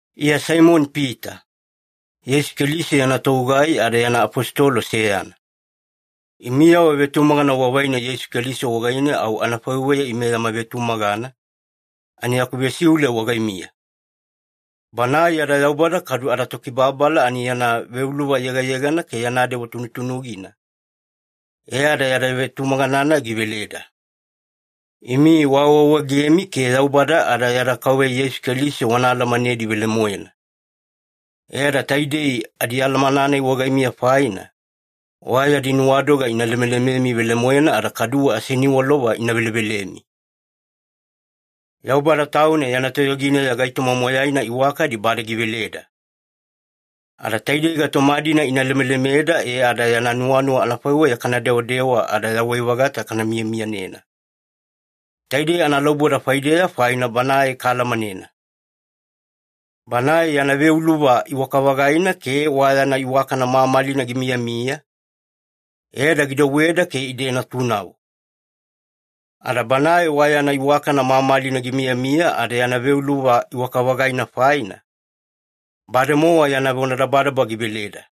Iya Saimoni-Pita, Yeisu Keliso yana togugai ada yana afositolo seyana. Imiyavo vetumagana wavaina Yeisu Keliso wagaine au anafaiweya ime yama vetumagana, ani yaku vesiule wagaimiya. Banae yada Yaubada kadu adaTokibababala ani yana veuluva yegayegana ke yana dewa tunutunugina, e ada yada vetumagana-nai giveleda. Imi waawaawaegemi ke Yaubada ada yada Kauveya Yeisu Keliso wana alamanedi velemoena. E ada taidei adialamana-nai wagaimiya faina, wa yadi nuwadoga ina lemelememi velemoena ada kaduwe aseniwalova ina velevelemi. Yaubada Tauna yana toyogineya gaitoma moyaina iwakadi bade giveleda. Ada taidei gaitoma-dina ina lemelemeda e ada yana nuwanuwa anafaiweya kana dewadewa ada yawai-vagata kana miyamiyanena. Taidei analauboda faideya faina Banae kaalamanena. Banae yana veuluva iwaka-vagaina ke wa yana iwakana mamalina gimiyamiya, e ada gidouweda ke ide natunavo. Ada Banae wa yana iwakana mamalina gimiyamiya ada yana veuluva iwaka-vagaina faina, bademowa yana vonadabadaba giveleda.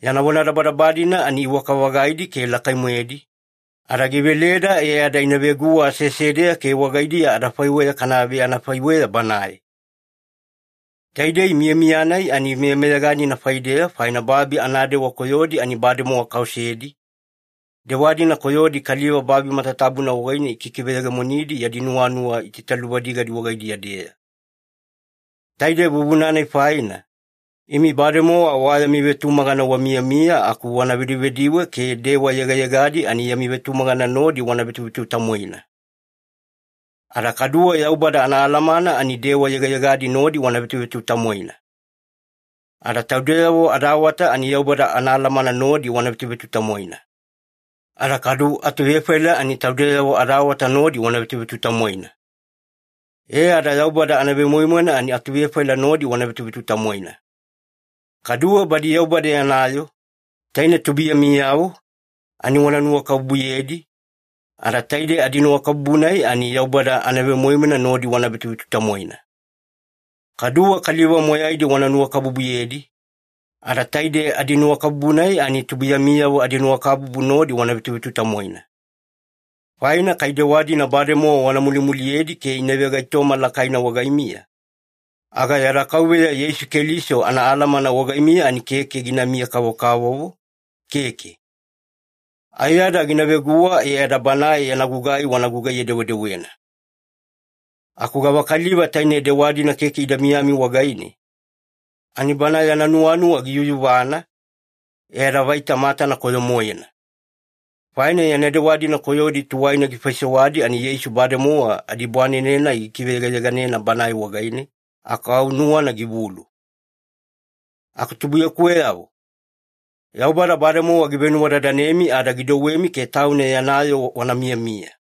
Yana vonadabadaba-dina ani iwaka-vagaidi ke lakai-moedi, ada giveleda e ada ina veguwa aseasedeya ke wagaidiya adafaiweya kana veanafaiweya Banae. Taidei miyamiya-nai ani meyameyaganina faideya faina babi anadewa koyodi ani bademowa kaosedi, dewa-dina koyodi kaliva babi matatabuna wagaine ikikiveyegemonidi yadi nuwanuwa itaitaluvadigadi wagaidiya-deya. Taide vuvuna-nai faina, imi bademowa wa yami vetumagana wamiyamiya aku wana vedivediwe ke dewa yegayegadi ani yami vetumagana nodi wana vetuvetutamwaina. Ada kaduwe Yaubada anaalamana ani dewa yegayegadi nodi wana vetuvetutamwaina. Ada taudeyavo adaawata ani Yaubada anaalamana nodi wana vetuvetutamwaina. Ada kadu atuvefaila ani taudeyavo adaawata nodi wana vetuvetutamwaina. E ada Yaubada anavemoimoina ani atuvefaila nodi wana vetuvetutamwaina. Kaduwe badi Yaubada yana yoo, taine tubuiyamiyavo, ani wana nuwakabubuyedi, ada taide adinuwakabubu-nai ani Yaubada anavemoimoina nodi wana vetuvetutamwaina. Kaduwe kaliva moyaidi wana nuwakabubuyedi, ada taide adinuwakabubu-nai ani tubuiyamiyavo adinuwakabubu nodi wana vetuvetutamwaina. Faina kai dewa-dina bademowa wana mulimuliyedi ke ina vegaitoma lakaina wagaimiya, aga yada Kauveya Yeisu Keliso anaalamana wagaimiya ani keke ginamiya-kavokavovo, keke. Aiyada gina veguwa e ada Banae yana gugai wana gugaiye-dewedewena. Aku gavakaliva taine dewa-dina keke ida miyami wagaine, ani bana yana nuwanuwa giyuyuvana, e ada vaita matana koyo-moena. Faina yana dewa-dina koyodi tuwaina gifaisewadi ani Yeisu bademowa adibwanene-nai gikiveyegayeganena banae wagaine, aku au nuwana givulu. Aku tubuiyakuweyavo, Yaubada bademowa givenuwadadanemi ada gidouwemi ke Tauna yana yoo wana miyamiya.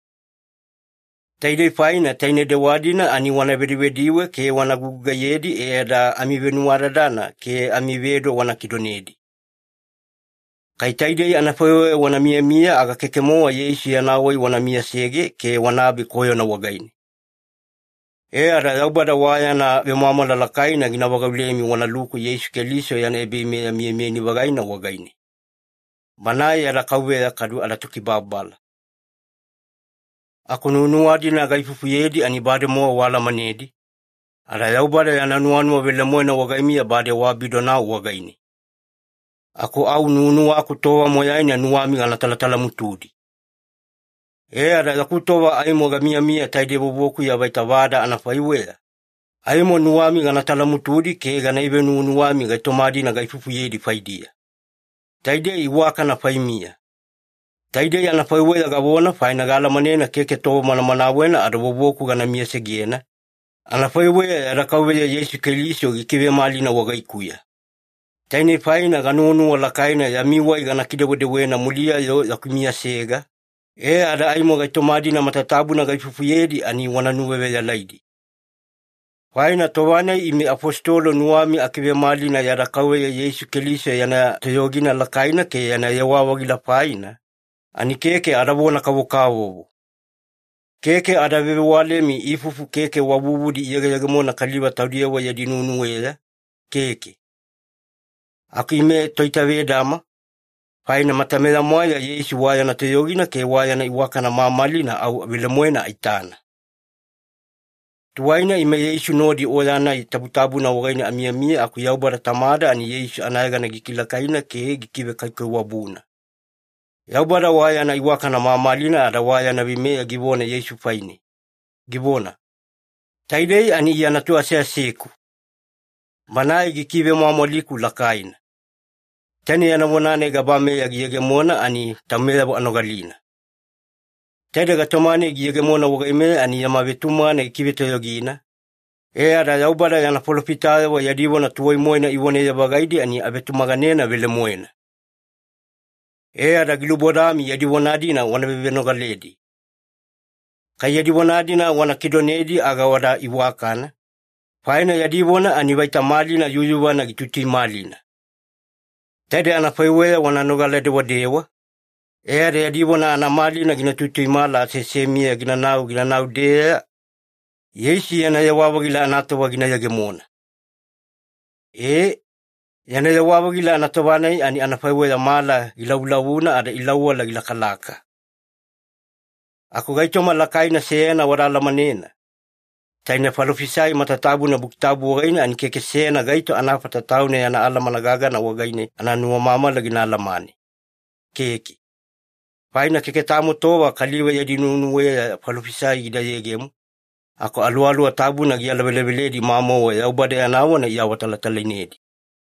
Taidei faina taine dewa-dina ani wana vedivediwe ke wana gugugaiyedi e ada amivenuwadadana ke amivedo wana kidonedi. Kai taidei anafaiweya wana miyamiya aga keke-mowa Yeisu yana wai wana miyasege ke wanabe koyona wagaine. E ada Yaubada wa yana vemwamwala lakaina gina vagaulemi wanaluku Yeisu Keliso yana ebaveimeya miyamiyani-vagaina wagaine. Banae yada Kauveya kadu adaTokibababala. Aku nuwanuwa-dina gaifufuyedi ani bademowa waalamanedi, ada Yaubada yana nuwanuwa velemoena wagaimiya bade waabidonau wagaine. Aku au nuwanuwaku tova moyaina nuwami gana talatalamutudi. E ada yaku tova aimo gamiyamiya taide vovokuya vaita vada anafaiweya, aimo nuwami gana talamutudi ke gana ivenuwanuwami gaitoma-dina gaifufuyedi faidiya. Taidei iwakana faimiya. Taidei anafaiweya gavona faina gaalamanena keke tova manamanawena ada vovoku gana miyasegena, anafaiweya yada Kauveya Yeisu Keliso gikivemalina wagaikuya. Tainei faina ganuwanuwa lakaina yami wai gana kidewedewena muliya-yo yaku miyasega, e ada aimo gaitoma-dina matatabuna gaifufuyedi ani wana nuwaveyalaidi. Faina tova-nai ime afositolo nuwami akivemalina yada Kauveya Yeisu Keliso yana toyogina lakaina ke yana yewa-vagila faina, ani keke adavona-kavokavovo. Keke ada vevewalemi ifufu keke wa vuvudi iyegeyegemona kaliva taudiyavo yadi nuwenuweya, keke. Aku ime toitavedama, faina matameya-mwaeya Yeisu wa yana toyogina ke wa yana iwakana mamalina au velemoena aitana. Tuwaina ime Yeisu nodi oya-nai tabutabuna wagaine amiyamiya aku Yaubada Tamada ani Yeisu anayegana gikilakaina ke gikivekaikaiwabuna. Yaubada wa yana iwakana mamalina ada wa yana veimeya givona Yeisu faine, givona, “Taidei ani Iya Natu aseaseku. Banae gikivemwamwaliku lakaina.” Taine yana vona-nai gabameya giyegemona ani taumeyavo anogalina. Taide gaitoma-nai giyegemona wagaimeya ani yama vetumagana gikivetoyogina, e ada Yaubada yana falofitayavo yadi vona tuwai-moena ivonaye-vagaidi ani avetumaganena velemoena. E ada gilubodami yadi vona-dina wana vevenogaledi. Kai yadi vona-dina wana kidonedi aga wada iwakana, faina yadi vona ani vaita malina yuyuvana gituituimalina. Taide anafaiweya wana nogala-dewadewa, e ada yadi vona anamalina gina tuituimala aseasemiya ginanau ginanau-deeya, Yeisu yana yewa-vagila anatova gina yegemona. Ee, yana yewa-vagila anatova-nai ani anafaiweya mala gilavulavuna ada Ilauwala gilakalaka. Aku gaitoma lakaina seyana wada alamanena, taine falofisai matatabuna Buki Tabu wagaine ani keke seyana gaito anafata tauna yana alamana gagana wagaine ananuwamamala gina alamane, keke. Faina keke tamo tova kaliva yadi nuwenuweya falofisai gida yegemo, aku Aluwaluwa Tabuna gialaveleveledi mamauwe Yaubada yana vona iawatalatalainedi.